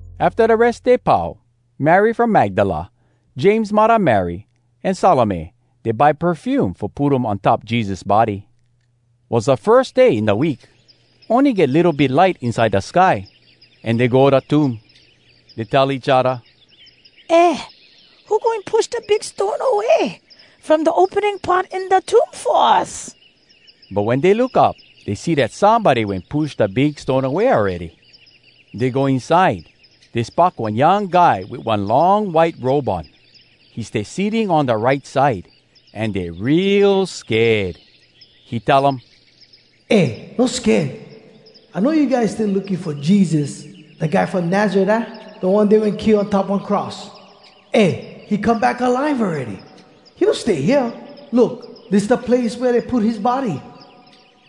Afta da Res Day pau, Mary from Magdala, James muddah Mary, an Salome, dey buy perfume fo put um on top Jesus body. Was da firs day in da week. Ony get litto bit light inside da sky, an dey go da tomb. Dey tell each odda, “Eh, who goin push da big stone away from da opening part in da tomb fo us?” But wen dey look up, dey see dat somebody wen push da big stone away awready. Dey go inside. Dey spock one young guy wit one long white robe on. He stay sitting on da right side. An dey real sked. He tell um, “Eh, no sked! I know you guys stay looking fo Jesus, da guy from Nazaret, aah? Da one dey wen kill on top one cross. Eh, he come back alive awready! He no stay hea. Look! Dis da place wea dey put his body.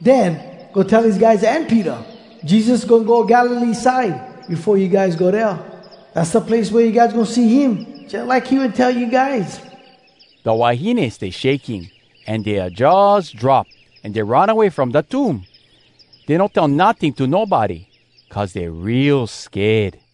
Den, go tell his guys an Peter, ‘Jesus goin go Galilee side befo you guys go dea. Dass da place wea you guys goin see him, jalike he wen tell you guys.’” Da wahines stay shaking an dea jaws drop, an dey run away from da tomb. Dey no tell notting to nobody, cuz dey real sked.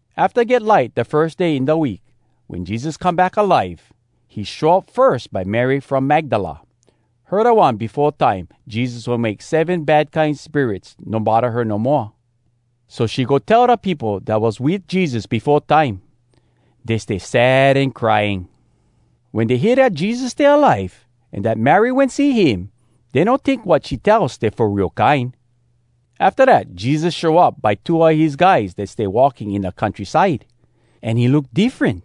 Afta get light da firs day in da week, wen Jesus come back alive, he show up firs by Mary from Magdala. (Her da one, befo time Jesus wen make seven bad kine spirits no bodda her no moa.) So she go tell da peopo dat was wit Jesus befo time. Dey stay sad an crying. Wen dey hear dat Jesus stay alive, an dat Mary wen see him, dey no tink wat she tell stay fo real kine. Afta dat Jesus show up by two a his guys dat stay walking in da countryside. An he look diffren.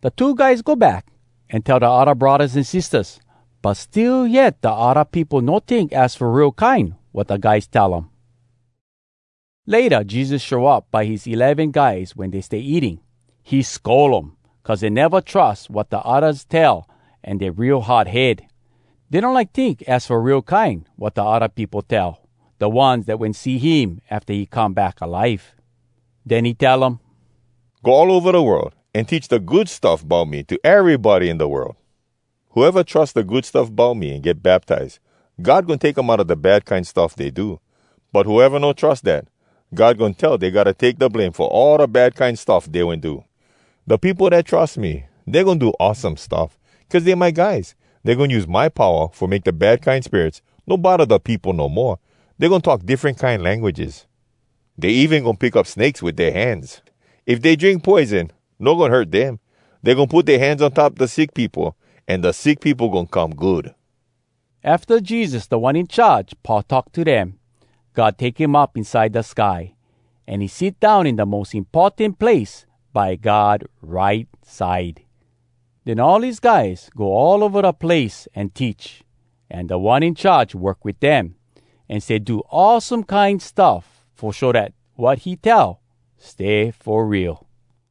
Da two guys go back, an tell da odda braddahs an sistahs. But still yet da odda peopo no tink az fo real kine wat da guys tell um. Layta Jesus show up by his eleven guys wen dey stay eating. He scold um, cuz dey neva trus wat da oddas tell an dey real hard head. Dey no like tink az fo real kine wat da odda peopo tell, da ones dat wen see him afta he come back alive. Den he tell um, “Go all ova da world, an teach da Good Stuff Bout Me to erybody in da world. Whoeva trus da Good Stuff Bout Me an get baptize, God goin take dem outa da bad kine stuff dey do. But whoeva no trus dat, God goin tell dey gotta take da blame fo all da bad kine stuff dey wen do. Da peopo dat trus me, dey goin do awesome stuff. Cuz dey my guys, dey goin use my powa fo make da bad kine spirits no bodda da peopo no moa. Dey goin talk diffren kine languages. Dey even goin pick up snakes wit dea hands. If dey drink poison, no goin hurt dem. Dey goin put dea hands on top da sick peopo, an da sick peopo goin come good.” Afta Jesus Da One In Charge pau talk to dem, God take him up inside da sky, an he sit down in da mos importan place by God right side. Den all his guys go all ova da place an teach. An Da One In Charge work wit dem, an stay do awesome kine stuff fo show dat wat he tell stay fo real.